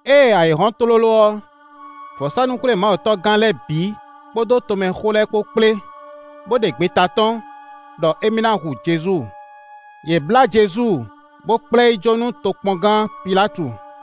Ée ayǐ hɔ́n tlóló ɔ́, vɔ̌sánú-xwlémawutɔ́gán lɛ́ɛ bǐ kpódó tomɛxó lɛ́ɛ kpó kplé, bó ɖe gbeta tɔ́n, ɖɔ émí ná hu Jezu. Yě blá Jezu, bó kplá ɛ yi jó nú tokpɔngán Pilátu.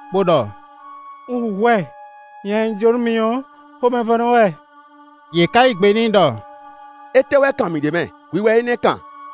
bó ɖɔ: “Un hu hwɛ; nya e un jó nú mi ɔ́, xomɛvɔ́nɔ wɛ.” Yě ká yí gbe n'i ɖɔ: “Étɛ́ wɛ kan mǐ ɖ'é mɛ? Hwi wɛ énɛ́ kan.”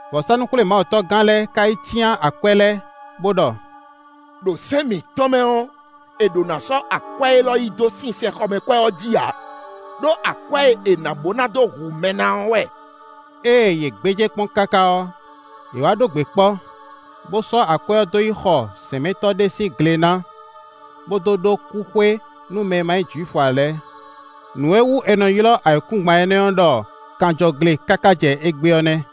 Vɔ̌sánú-xwlémawutɔ́gán lɛ́ɛ ka yi cyán akwɛ́ lɛ́ɛ, bó ɖɔ: “Ɖo sɛ́n mǐtɔn mɛ ɔ́, è ɖǒ ná sɔ́ akwɛ́ élɔ́ yi dó sinsɛnxɔmɛkwɛ́ ɔ́ jí ǎ, ɖó akwɛ́ e è nǎ bó ná dó hu mɛ ná ɔ́ wɛ.” Ée yě gbéjé kpɔ́n káká ɔ́, yě wá ɖó gbe kpɔ́, bó sɔ́ akwɛ́ ɔ́ dó yi xɔ zɛ̌nmɛtɔ́ ɖé sín gle ná, bó dó ɖó kúxwé nú mɛ e ma nyí Jwifu ǎ lɛ́ɛ. Nǔ e wú è nɔ ylɔ́ ayǐkúngban énɛ́ ɔ́ ɖɔ kanjɔgle káká jɛ égbé ɔ́ nɛ́.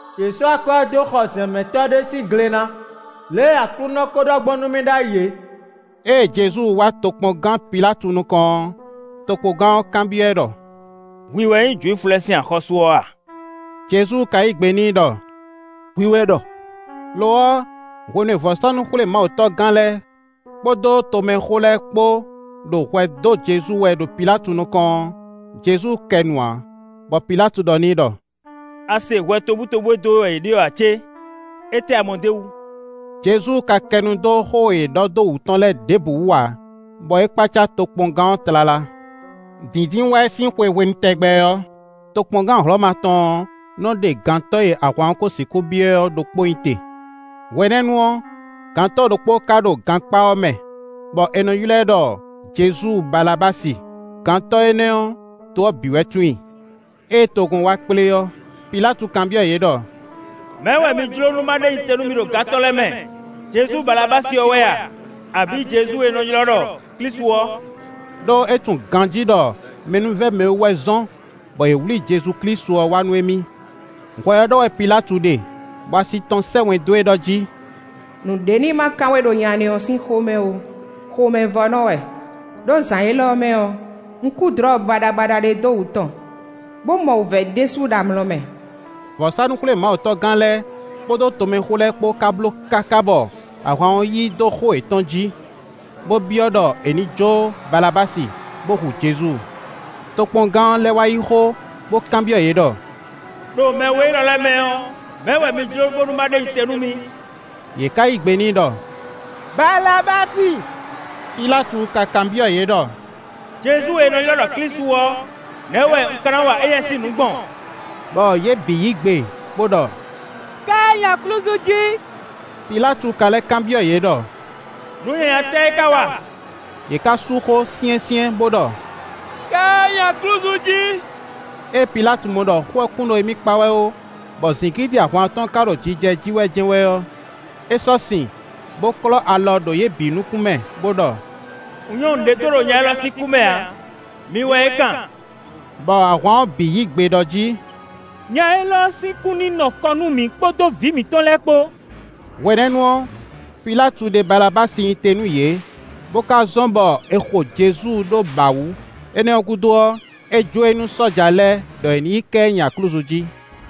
Yě sɔ́ akwɛ́ ɔ́ dó xɔ zɛ̌nmɛtɔ́ ɖé sín gle ná, lě e Aklúnɔ ko ɖɔ gbɔn nú mì ɖ'ayǐ é.” Ée Jezu wá tokpɔngán Pilátu nukɔn ɔ́, tokpɔngán ɔ́ kanbyɔ́ ɛ ɖɔ: “Hwi wɛ nyí Jwifu lɛ́ɛ sín axɔ́sú ɔ́ a?” Jezu ka yí gbe n'i ɖɔ: “Hwi wɛ ɖɔ.” Lo ɔ́, hwenu e vɔ̌sánú-xwlémawutɔ́gán lɛ́ɛ kpódó tomɛxó lɛ́ɛ kpó ɖo hwɛ dó Jezu wɛ ɖo Pilátu nukɔn ɔ́, Jezu kɛ nu ǎ, bɔ Pilátu ɖɔ n'i ɖɔ: “A se hwɛ tobutóbú e dó we wɛ yě ɖe ɔ́ ǎ cé? Étɛ́ a mɔ d'é wú?” Jezu ka kɛ nu dó xó e yě ɖɔ dó wǔtu tɔn lɛ́ɛ ɖěbǔ wú ǎ, bɔ é kpácá tokpɔngán ɔ́ tlala. Dǐndínwáyi sín xwe hwenu tɛgbɛ ɔ́, tokpɔngán Hlɔ̌ma tɔn ɔ́ nɔ́ ɖe gantɔ́ e ahwan ɔ́ ko sixú byɔ́ ɛ ɔ́ ɖokpó nyi te. Hwenɛ́nu ɔ́, gantɔ́ ɖokpó ka ɖo gankpá ɔ́ mɛ, bɔ è nɔ ylɔ́ ɛ ɖɔ Jezu Balabási. Gantɔ́ énɛ́ ɔ́, to ɔ́ bǐ wɛ tunwun i. Ée togun ɔ́ wá kplé ɔ́, Pilátu kanbyɔ́ yě ɖɔ: “Mɛ̌ wɛ mi jló nú ma ɖe nyi te nú mi ɖo gantɔ́ lɛ́ɛ mɛ? Jezu Balabási ɔ́ wɛ a, abǐ Jezu e è nɔ ylɔ́ ɖɔ Klísu ɔ́?” Ɖó é tunwun ganjí ɖɔ mɛnúvɛ́mɛwú wɛ zɔ́n bɔ yě wlí Jezu Klísu ɔ́ wá nú émí. Hwɛ ɔ́ ɖɔ wɛ Pilátu ɖe, bɔ asi tɔn sɛ́ wɛn dó e ɖɔ jí: “Nǔɖé ní má kan we ɖo nya énɛ́ ɔ́ sín xó mɛ ó, xomɛvɔ́nɔ wɛ. Ɖó zǎn élɔ́ mɛ ɔ́, un kú dlɔ̌ baɖabaɖa ɖé dó wǔ tɔn, bó mɔ wǔvɛ́ ɖésú ɖo amlɔ mɛ.” Vɔ̌sánú-xwlémawutɔ́gán lɛ́ɛ kpódó tomɛxó lɛ́ɛ kpó ka bló káká bɔ ahwan ɔ́ yí dó xó yětɔn jí, bó byɔ́ ɖɔ è jǒ Balabási, bó hu Jezu. Tokpɔngán ɔ́ lɛ́ wá yí xó, bó kanbyɔ́ yě ɖɔ: “Ɖo mɛ we élɔ́ lɛ́ɛ mɛ ɔ́, mɛ̌ wɛ mi jló bónú má ɖe nyi te nú mi?” Yě ká yí gbe n'i ɖɔ: “Balabási.” Pilátu ka kanbyɔ́ yě ɖɔ: “Jezu e è nɔ ylɔ́ ɖɔ Klísu ɔ́, nɛ̌ wɛ un ka ná wa éyɛ́ sín nǔ gbɔn?” Bɔ yě bǐ yí gbe bó ɖɔ: “Ká ɛ nyi aklúzu jí.” Pilátu ka lɛ́ kanbyɔ́ yě ɖɔ: “Nǔ nyanya tɛ́ wɛ é ká wa?” Yě ká sú xó syɛ́nsyɛ́n bó ɖɔ: “Ká ɛ nyi aklúzu jí.” Ée Pilátu mɔ ɖɔ xó ɔ́ kún ɖo émí kpa wɛ ó, bɔ zǐngídi ahwan ɔ́ tɔn ká ɖo jijɛ jí wɛ jɛ́n wɛ ɔ́, é sɔ́ sin, bó klɔ́ alɔ ɖo yě bǐ nukún mɛ, bó ɖɔ: “Un nyɔ́ nǔɖé do ɖo nya élɔ́ sín kú mɛ ǎ; mi wɛ é kan.” Bɔ ahwan ɔ́ bǐ yí gbe ɖɔ jí: “Nya élɔ́ sín kú ní nɔ kɔ nú mǐ kpódó vǐ mǐtɔn lɛ́ɛ kpó.” Hwenɛ́nu ɔ́, Pilátu ɖe Balabási nyi te nú yě, bo ka zɔ́n bɔ è xo Jezu ɖó bǎ wu. Énɛ́ ɔ́ gúdo ɔ́, é jó e nú sɔ́ja lɛ́ɛ ɖɔ è ní yi ká ɛ nyi aklúzu jí.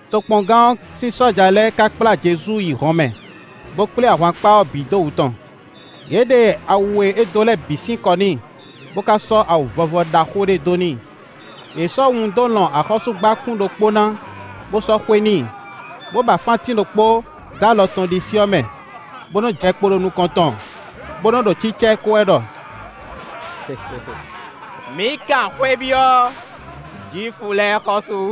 Tokpɔngán ɔ́ sín sɔ́ja lɛ́ɛ ka kplá Jezu yi hɔnmɛ, bo kplé ahwankpá ɔ́ bǐ dó wǔ tɔn. Yě ɖe awu e é dó lɛ́ɛ bǐ sín kɔ n'i, bó ka sɔ́ awu vɔvɔ ɖaxó ɖé dó n'i. Yě sɔ́ wun dó lɔn axɔ́súgbákún ɖokpó ná, bó sɔ́ xwe n'i, bó ba fántín ɖokpó dó alɔ tɔn ɖisí ɔ́ mɛ, bó nɔ́ jɛ kpo ɖo nukɔn tɔn, bó nɔ́ ɖo cícá ɛ ko wɛ ɖɔ: “Mǐ kan xwé byɔ́, Jwifu lɛ́ɛ xɔ́sú!”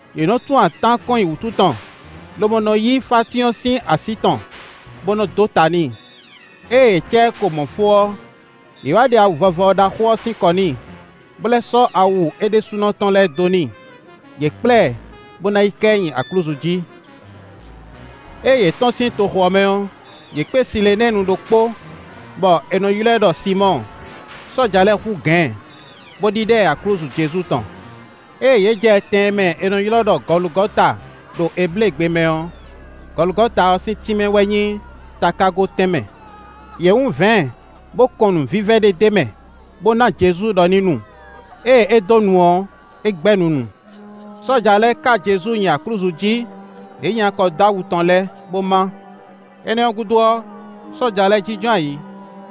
Yě nɔ tún atán kɔn nyi wǔtu tɔn, lobo nɔ yí fántín ɔ́ sín así tɔn, bo nɔ dó ta n'i. Ée yě cá ɛ ko mɔ̌ fó ɔ́, yě wá ɖe awu vɔvɔ ɖaxó ɔ́ sín kɔ n'i, bó lɛ́ sɔ́ awu é ɖésúnɔ tɔn lɛ́ɛ dó n'i. Yě kplá ɛ, bó ná yi ká ɛ nyi aklúzu jí. Ée yě tɔ́n sín toxo ɔ́ mɛ ɔ́, yě kpé Silenɛ́ɛnu ɖokpó, bɔ è nɔ ylɔ́ ɛ ɖɔ Sinmɔ́ɔ. Sɔ́ja lɛ́ɛ hú gǎn ɛ, bó ɖíɖá ɛ aklúzu Jezu tɔn. Ée yě jɛ tɛn e mɛ è nɔ ylɔ́ ɖɔ Gɔlugɔta dó Ebléegbe mɛ ɔ́, Gɔlugɔta ɔ́ sín tínmɛ wɛ nyí “takágo tɛnmɛ”. Yě wún vɛ̌ɛn bó kɔn nǔvívɛ́ ɖé d'é mɛ, bó ná Jezu ɖɔ ní nu. Ée é dó nu ɔ́, é gbɛ́ nunu. Sɔ́ja lɛ́ɛ ká Jezu nyi aklúzu jí; yě nyi akɔ dó awu tɔn lɛ́ɛ, bó má. Énɛ́ ɔ́ gúdo ɔ́, sɔ́ja lɛ́ɛ jínjɔ́n ayǐ,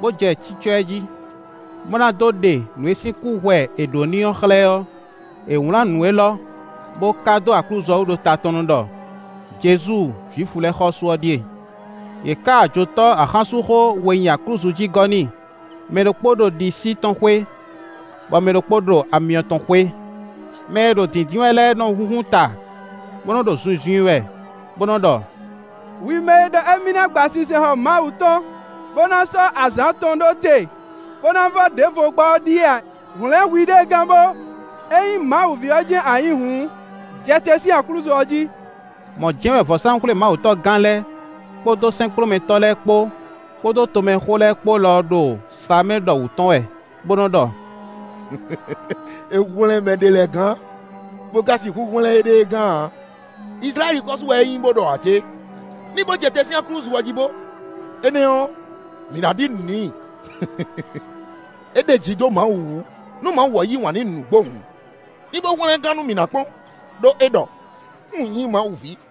bó jɛ cícɔ́ ɛ jí. Bó ná dó ɖe nǔ e sín kúhwɛ è ɖǒ n'i ɔ́ xlɛ́ ɔ́, è wlǎn nǔ élɔ́, bó ká dó aklúzu ɔ́ wú ɖo ta tɔn nu ɖɔ: “Jezu, Jwifu lɛ́ɛ xɔ́sú ɔ́ ɖíe.” Yě ká ajotɔ́ axánsúnxó we nyi aklúzu jí gɔ́ n'i: mɛ ɖokpó ɖo ɖisí tɔn xwé, bɔ mɛ ɖokpó ɖo amyɔ tɔn xwé. Mɛ e ɖo dǐndín wɛ lɛ́ɛ nɔ́ húnhún ta, bó nɔ ɖo zunzun i wɛ, bó nɔ́ ɖɔ: “Hwi mɛ e ɖɔ émí ná gba sinsɛnxɔ Mawu tɔn, bó ná sɔ́ azǎn atɔn ɖó te, bó ná vɔ́ ɖěvo gbá ɔ́ ɖíe a? Hwlɛ̌n hwiɖée gán bó! Ényí Mawu ví ɔ́ jɛ́n a nyǐ hǔn, jɛ te sín aklúzu ɔ́ jí.” Mɔ̌ jɛ́n wɛ vɔ̌sánú-xwlémawutɔ́gán lɛ́ɛ, kpódó sɛ́nkplɔ́nmɛtɔ́ lɛ́ɛ kpó, kpódó tomɛxó lɛ́ɛ kpó lɔ ɖo slǎmɛ ɖɔ wǔ tɔn wɛ, bó nɔ́ ɖɔ: “É hwlɛ́n mɛ ɖě lɛ́ɛ gán, bó ka sixú hwlɛ́n éɖée gán ǎ. Izlayɛ́li xɔ́sú wɛ é nyí bó ɖɔ ǎ cé? Ní bó jɛ te sín aklúzu ɔ́ jí bó! Énɛ́ ɔ́, mǐ ná ɖi nǔ n'i. É ɖeji dó Mawu wú; nú Mawu ɔ́ yí wǎn n'i nǔgbó hǔn, ní bó hwlɛ́n ɛ gán nú mǐ ná kpɔ́n; ɖó é ɖɔ: ‘Un nyí Mawu ví.’”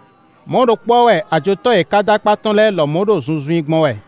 Mɔ̌ ɖokpó ɔ́ wɛ ajotɔ́ e è ká ɖó akpá tɔn lɛ́ɛ lɔmɔ̌ ɖo zunzun i gbɔn wɛ.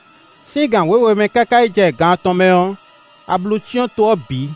Sín gan wěwe mɛ káká yi jɛ gan atɔn mɛ ɔ́, ablu cyɔ́n to ɔ́ bǐ.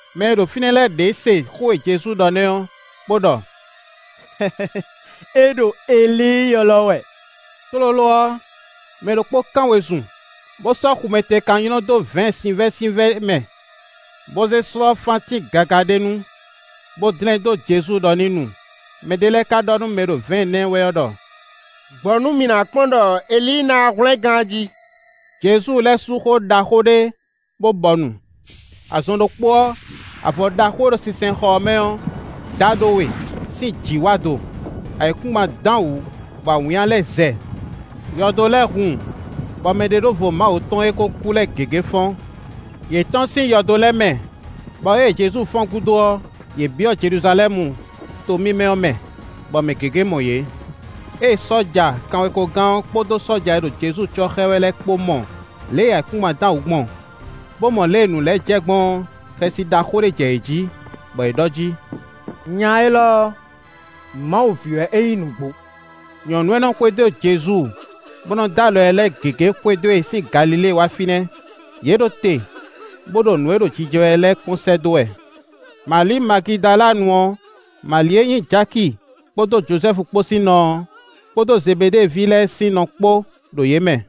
Mɛ e ɖo fínɛ́ lɛ́ɛ ɖě se xó e Jezu ɖɔ nɛ́ ɔ́, bó ɖɔ: “É ɖo Elíi ylɔ́ wɛ.” Tlóló ɔ́, mɛ ɖokpó kán wezun, bó sɔ́ xumɛtekan nylɔ́ dó vɛ̌ɛn sinvɛ́sinvɛ́ mɛ, bó zé slɔ́ fántín gaga ɖé nu, bó dlɛ́n dó Jezu ɖɔ ní nu. Mɛ ɖé lɛ́ɛ ka ɖɔ nú mɛ e ɖo vɛ̌ɛn ná ɛ wɛ ɔ́ ɖɔ: “Gbɔ nú mǐ ná kpɔ́n ɖɔ Elíi ná wá hwlɛ́n ɛ gán a jí.” Jezu lɛ́ sú xó ɖaxó ɖé, bó bɔnu. Azɔn ɖokpó ɔ́, avɔ ɖaxó e ɖo sinsɛnxɔ mɛ ɔ́ dá ɖó we, sín jǐ wá do; ayǐkúngban dán wǔ, bɔ awǐnnya lɛ́ɛ zɛ. Yɔdo lɛ́ɛ hun, bɔ mɛɖeɖóvo Mawu tɔn e kó kú lɛ́ɛ gěgé fɔ́n. Yě tɔ́n sín yɔdo lɛ́ɛ mɛ, bɔ ée Jezu fɔ́n gúdo ɔ́, yě byɔ́ Jeluzalɛ́mu to mímɛ́ ɔ́ mɛ, bɔ mɛ gěgé mɔ yě. Ée sɔ́ja kanwekogán ɔ́ kpódó sɔ́ja e ɖo Jezu cɔ́ xá ɛ wɛ lɛ́ɛ kpó mɔ lě e ayǐkúngban dán wǔ gbɔn, bó mɔ lě e nǔ lɛ́ɛ jɛ gbɔn ɔ́, xɛsi ɖaxó ɖé jɛ yě jí, bɔ yě ɖɔ jí: “Nya élɔ́ ɔ́, Mawu ví wɛ é nyí nǔgbó.” Nyɔ̌nu e nɔ xwedó Jezu bó nɔ dó alɔ ɛ lɛ́ɛ gěgé xwedó e sín Galilée wá fínɛ́. Yě ɖo te, bó ɖo nǔ e ɖo jijɛ wɛ lɛ́ɛ kpɔ́n sɛ́ dó wɛ. Mali Magidalanu ɔ́, Mali e nyí Jaki kpódó Jozɛ́fu kpó sín nɔ ɔ́, kpódó Zebeɖée ví lɛ́ɛ sín nɔ kpó ɖo yě mɛ.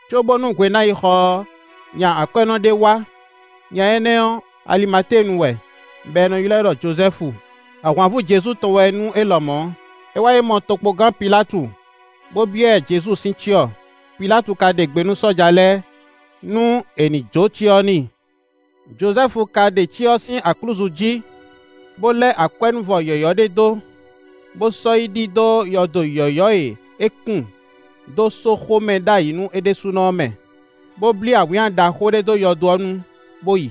Cóbónú hwe ná yi xɔ ɔ́, nya akwɛ́nɔ ɖé wá; nya énɛ́ ɔ́, Alimatéenu wɛ, bɔ è nɔ ylɔ́ ɛ ɖɔ Jozɛ́fu; ahwanvú Jezu tɔn wɛ nú é lɔmɔ̌. É wá yi mɔ tokpɔngán Pilátu, bó byɔ́ ɛ Jezu sín cyɔ. Pilátu ka ɖe gbe nú sɔ́ja lɛ́ɛ, nú è ní jó cyɔ ɔ́ n'i. Jozɛ́fu ka ɖe cyɔ ɔ́ sín aklúzu jí, bó lɛ́ akwɛ́núvɔ yɔ̌yɔ́ ɖé dó, bó sɔ́ yi ɖi dó yɔdo yɔ̌yɔ́ e é kún dó sóxo mɛ ɖ'ayǐ nú é ɖésúnɔ ɔ́ mɛ, bó blí awǐnnya ɖaxó ɖé dó yɔdo ɔ́ nu, bó yi.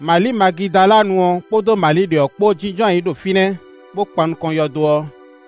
Mali Magidalanu ɔ́ kpódó Mali ɖě ɔ́ kpó jínjɔ́n ayǐ ɖo fínɛ́, bó kpan nukɔn yɔdo ɔ́.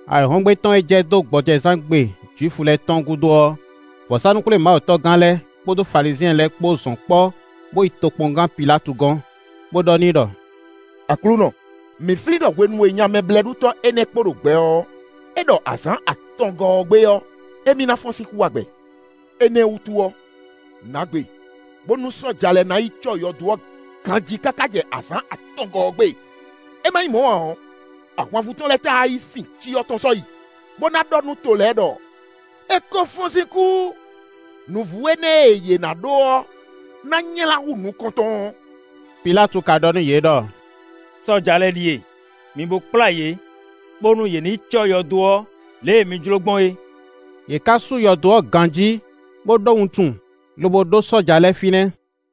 Ayǐhɔ́ngbe tɔn e jɛ dó gbɔjɛzán gbe Jwifu lɛ́ɛ tɔn gúdo ɔ́, vɔ̌sánú-xwlémawutɔ́gán lɛ́ɛ kpódó Falizyɛn lɛ́ɛ kpó zɔn kpɔ́ bo yi tokpɔngán Pilátu gɔ́n. Bó ɖɔ n'i ɖɔ: “Aklúnɔ, mǐ flín ɖɔ hwenu e nya mɛblɛ́ɖutɔ́ énɛ́ kpo ɖo gbɛ ɔ́, é ɖɔ azǎn atɔngɔ́ ɔ́ gbe ɔ́, émí ná fɔ́n sín kú wá gbɛ. Énɛ́ wútu ɔ́, nǎ gbe, bónú sɔ́ja lɛ́ɛ ná yi cɔ́ yɔdo ɔ́ ganjí káká jɛ azǎn atɔngɔ́ ɔ́ gbe. É má nyí mɔ̌ ǎ ɔ́, ahwanvú tɔn lɛ́ɛ táá wá yi fin cyɔ tɔn sɔ́ yi, bó ná ɖɔ nú to lɛ́ɛ ɖɔ: ‘É kó fɔ́n sín kú; nǔvú énɛ́ e yě ná ɖó ɔ́ ná nylá hú nukɔntɔn ɔ́.’” Pilátu ka ɖɔ nú yě ɖɔ: “Sɔ́ja lɛ́ɛ ɖíe, mi bo kplá yě bónú yě ní yi cɔ́ yɔdo ɔ́ lě e mi jló gbɔn é.” Yě ká sú yɔdo ɔ́ ganjí, bó ɖó wuntun, lobo ɖó sɔ́ja lɛ́ɛ fínɛ́.